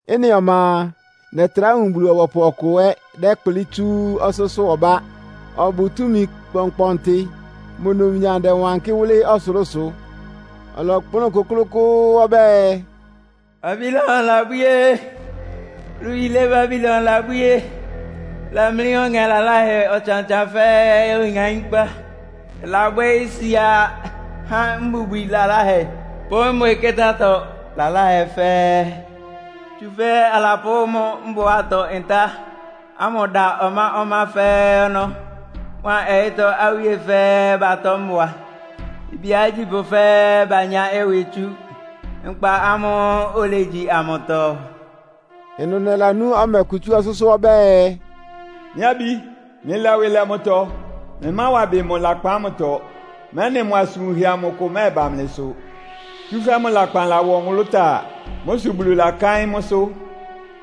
Ɩ́nɩ ɔma a, nɛtrá wun Bulu-ɔbɔpʋ ɔkʋ ɛ́ dɛ́kplɩ́ tsú ɔsʋ́sʋ́ ɔbá. Ɔbʋ túmi kpɔnkpɔntɩ. Mʋ numnyam dɛwankɩ́ wʋ́lɩ́ ɔsʋlʋ́sʋ. Ɔlɔkplʋ́n kʋ́klʋ́kʋ́ʋ́ ɔbɛ́ɛ, “Babilon labwíé! Wúlu yílé Babilon labwíé! Ɩlamlí ɔŋɛ laláhɛ ɔtsan-ɔtsan fɛ́ɛ́ oŋaínkpá. Ɩlabwɛ́ isia há mbubwi laláhɛ pʋ́ mbwɩkɩ́tá-atɔ laláhɛ fɛ́ɛ́. Tsúfɛ́ alapʋ́ mʋ mbʋatɔ-ntá ámʋ dá ɔmá-ɔmá fɛ́ɛ́ ɔnɔ́. Mʋa ɔyɩ́tɔ́ awíe fɛ́ɛ́ batɔ́ mbʋa. Ibíá agyípʋ́ fɛ́ɛ́ banyá ɩwɩ tsú nkpa ámʋ́ʋ́ olegyi amʋtɔ.” Ɩnʋ nɛlanú ɔmɛ kʋ tsú ɔsʋ́sʋ́ ɔbɛ́ɛ, “Mɩ́ abí, mlɩlɛ ɩwɩ lɛ mʋtɔ! Mlɩmáwa ɩbɩ mʋ lakpan ámʋtɔ, mɛ́nɩ mʋ asʋn wunhɛ amʋ kʋ mɛ́ɛba mlɩsʋ. Tsúfɛ́ mʋ lakpan lawɔ nwʋlʋ́táa. Mʋ́ sʋ Bulu lakáɩ́n mʋ́sʋ́.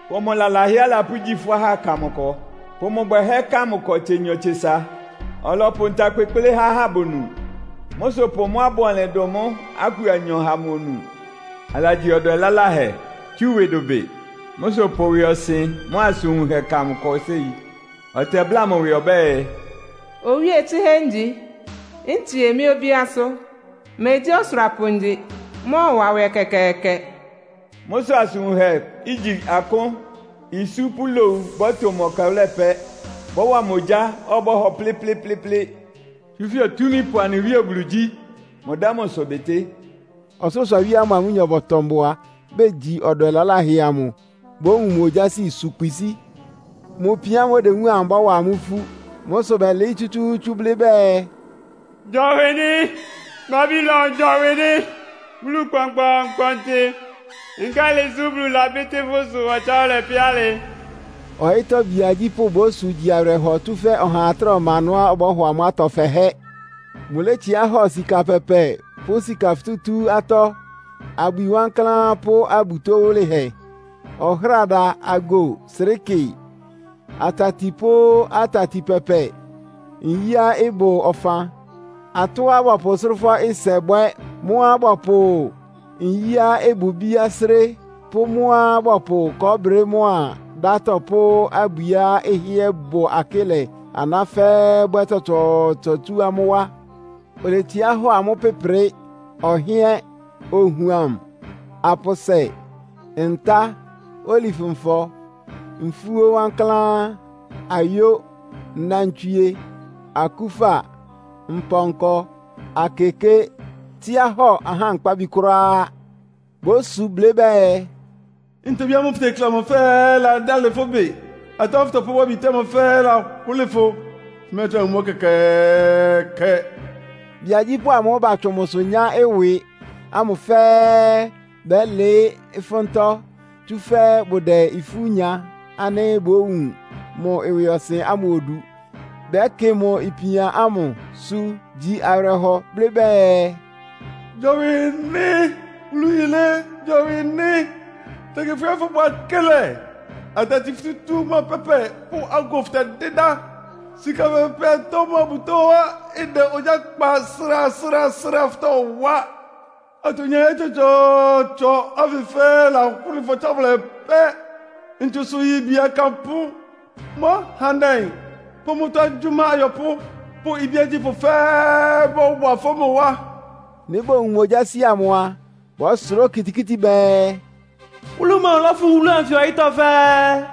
Pʋ mʋ lalahɛá alapʋ́gyí fʋ́ ahá ka mʋ ɩkɔ. Pʋ mʋ bwɛhɛ́ ka mʋ ɩkɔ tsenyɔ-tsesa. Ɔlɔpʋ nta kpekplé há ahá bonu. Mʋ́ sʋ pʋ mʋ́á ɩbʋ ɔnlɩn dʋn mʋ́ aku anyɔ ha mʋ onu. Alagyi ɔdwɛ laláhɛ, tsú ɩwɩ dʋbɩ. Mʋ́ sʋ pʋ ɩwɩɔsɩn mʋ́a asʋn wunhɛ ka mʋ ɩkɔ séi. Ɔtɛbláa mʋ ɩwɩ ɔbɛ́ɛ, ‘Owíe tsɩhɛ́ ngyi, ntsie mɩ́ obíásʋ́. Megyí ɔsʋrapʋ ngyi, mmɔ́ɔwa nwɛ ɛkɛkɛɛkɛ!’ Mʋ́ sʋ asʋn wunhɛá igyi akʋ́n, isú pʋ́ lowu bɔ́tʋ mʋ ɛkɛwʋ́lɛ pɛ́. Bɔ́wa mʋ ogyá, ɔbɔ́hɔ plɩ́plɩ́plɩ́plɩ́, tsúfɛ́ Otúmípʋ anɩ Wíe Bulu gyí. Mʋdɛ́ mʋ ɩsʋ bɩtɩ́.” Ɔsʋlʋ́sʋ awíe amʋ́ʋ́ mʋa amʋ́nyɔ bɔtɔ mbʋa, begyi ɔdwɛ laláhɛ amʋ bówun mʋ ogyási, su kpisíi. Mʋ ipian ámʋ́ʋ́ odewúun amʋ ɩbɔ́wa amʋ́ ifú. Mʋ́ sʋ bɛ́lɩɩ́ tsútsúútsú blɩ́ bɛɛ, “Gyɔwɩ nɩ́! Babilon gyɔwɩ nɩ́! Wúlu kpɔnkpɔɔnkpɔntɩ, nkálɩ sʋ Bulu labɩ́tɩ́ fʋ́ ɩsʋ ɔtsáwʋlɛ pɛ́ alɩ?” Ɔyɩ́tɔ́ bíá agyípʋ́ bósu, gyi awɩrɛhɔ, tsúfɛ́ ɔhaa trá ɔma ɩnʋá ɔbɔ́hɔ amʋ́ atɔ fɛhɛ́. Mʋlétsiá hɔ sika pɛpɛ pʋ́ sika futútú atɔ́, abwi wankláán pʋ́ abutó wʋlɩhɛ, ɔhráda, ago, srɩ́kɩ atati pʋ́ atati pɛpɛ, nyíá ɩbʋ ɔfan, atɔ́á bɔpʋ sʋ́rʋ́fɔ́-ɩsɛ bwɛ́, mʋ́á bɔpʋ nyíá ɩbʋ ibíá sré, pʋ́ mʋ́á bɔpʋ kɔɔ́brɩ mʋ́á dátɔ pʋ́ abwiá ɩhɩ́ɛ́ bʋ akɩ́lɛ aná fɛ́ɛ́ bwɛ́ tsɔtsɔɔtsɔ tsú amʋ́ wá. Oletsiá hɔ amʋ́ pɩ́prɩ, ɔhɩ́ɛ́n, ohuam, apʋsɛ, ntá, olif-nfɔ, nfúó wankláán, ayó, nnantswie, akúfa, mpɔnkɔ, akeké, tsíá hɔ ahá nkpábi kʋ́ráá. Bósu blɩ́ bɛɛ, “Ntobí ámʋ́ʋ́ fʋtekle amʋ fɛ́ɛ́ ladálɩ fʋ́ ɩbɩ. Atɔ́ ámʋ́ʋ́ fʋ́tɔpʋ́wá bite ámʋ fɛ́ɛ́ lahʋ́lɩ fʋ. Fʋmɛ́ɛtrá wun mʋ́ ɛkɛkɛɛkɛ!” Bíá agyípʋ́ amʋ́ʋ́ batsʋn mʋsʋ nyá ɩwɩ ámʋ fɛ́ɛ́ bɛ́lɩɩ́ ɩfʋ́ntɔ́, tsúfɛ́ bʋdɛ ifú nya ánɩ́ bówun mʋ ɩwɩɔsɩn ámʋ odu. Bɛ́kɩ mʋ ipian ámʋ, su gyi awɩrɛhɔ! Bɛ́blɩ́ bɛɛ, “Gyɔwɩ nɩ́! Wúlu yilé, gyɔwɩ nɩ́! Tɛkɩ fʋhɩ́ɛ́ fʋbʋ akɩ́lɛ. Atati fútútú mʋ́a pɛ́pɛ pʋ́ ago fʋtɛdɩ́dá. Sika pɛpɛ atɔ́ mʋ́a abutóá ɩdɛ ogyá kpa srasrasra fʋtɔwá. Atonyahɛ́ tsɔtsɔɔtsɔ ánfɩ fɛ́ɛ́ lahʋ́lɩ fʋ ɔtsáwʋlɛ pɛ́!” Ntsusʋ-yibi akanpʋ́, mʋ́ ahandɛ pʋ́ mʋ́tɔ́ agyʋ́má ayɔpʋ́ pʋ́ ibíá agyípʋ́ fɛ́ɛ́ bɔ́wa ɩfɔ́ mʋ wá. Nɩ́ bowun mʋ ogyási amʋ a, bɔ́sʋrá okitikíti bɛɛ, “Wúlu mɔmʋ lɔ́fʋn wúlu ánfɩ ɔyɩ́tɔ́ fɛ́ɛ́?”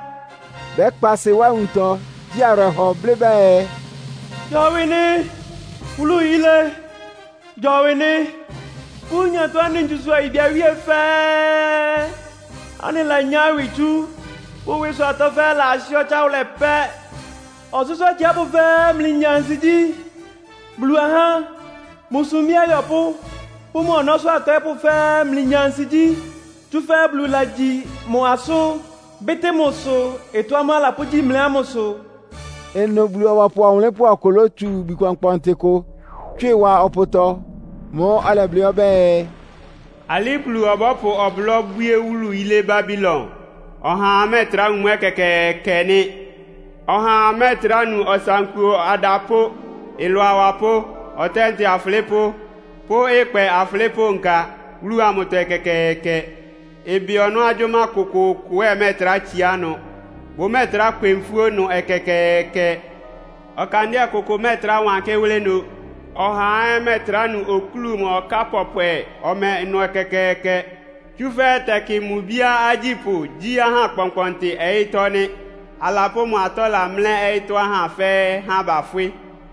Bɛ́kpa ɩsɩ wá nwuntɔ, gyi awɩrɛhɔ, blɩ́ bɛɛ, “Gyɔwɩ nɩ́. Wúlu yilé, gyɔwɩ nɩ́! Fʋ́ nyatɔ anɩ ntsusʋ ayibi awíe fɛ́ɛ́ anɩlanyá ɩwɩ tsú. Fʋ́ ɩwɩsʋ atɔ́ fɛ́ɛ́ lahɩ́ ɔtsáwʋlɛ pɛ́!” Ɔsʋ́sʋ́ atsiápʋ́ fɛ́ɛ́, mlɩnya ansigyí. Bulu ahá, mʋ sumbí ayɔpʋ́ pʋ́ mʋ ɔnɔ́sʋ́ atɔɩ́pʋ́ fɛ́ɛ́, mlɩnya ansigyí. Tsúfɛ́ Bulu lagyi mʋ asʋ́n, bɩ́tɩ́ mʋ ɩsʋ, ɩtɔ́ ámʋ́ʋ́ alapʋ́gyí mlɩ ámʋ sʋ. Ɩnʋ Bulu-ɔbɔpʋ ɔwʋnlɩ́npʋ́ ɔkʋ lótsu ibwi kpɔnkpɔntɩ kʋ, tswɩ wa ɔpʋtɔ. Mʋ́ʋ́ ɔlɛblɩ́ ɔbɛ́ɛ, “Alɩ́ Bulu ɔbɔ́pʋ ɔblɔ́ bwíé wúlu yilé Babilon, ɔhaa mɛ́ɛtrá wun mʋ́ ɛkɛkɛɛkɛ nɩ́. Ɔhaa mɛ́ɛtrá nu ɔsankuo adapʋ́, ɩlʋ awapʋ́, ɔtɛ́ntɛ afʋlɩ́pʋ́ pʋ́ ɩkpɛ afʋlɩ́pʋ́ nka wúlu amʋtɔ ɛkɛkɛɛkɛ. Ɩbɩ ɔnɔ́ agyʋ́má kʋkʋʋkʋ ɛ́ ɩmɛ́ɛtrá tsiá ɩnʋ. Bʋmɛ́ɛtrá kwɛ nfúó ɩnʋ ɛkɛkɛɛkɛ. Ɔkandɩ́ɛ kʋkʋ mɛ́ɛtrá wankɩ́ wʋ́lɩ́ ɩnʋ, ɔhaa ɛ́ mɛ́ɛtrá nu okúlu mʋ́a ɔká pɔpwɛ ɔmɛ ɩnʋ ɛkɛkɛɛkɛ. Tsúfɛ́ tɛkɩ mʋ ibíá agyípʋ́ gyí aha kpɔnkpɔntɩ ɔyɩ́tɔ́ nɩ́. Alapʋ́ mʋ atɔ́la mlɛ́ ɔyɩ́tɔ́ ahá fɛ́ɛ́, há bafwɩ́!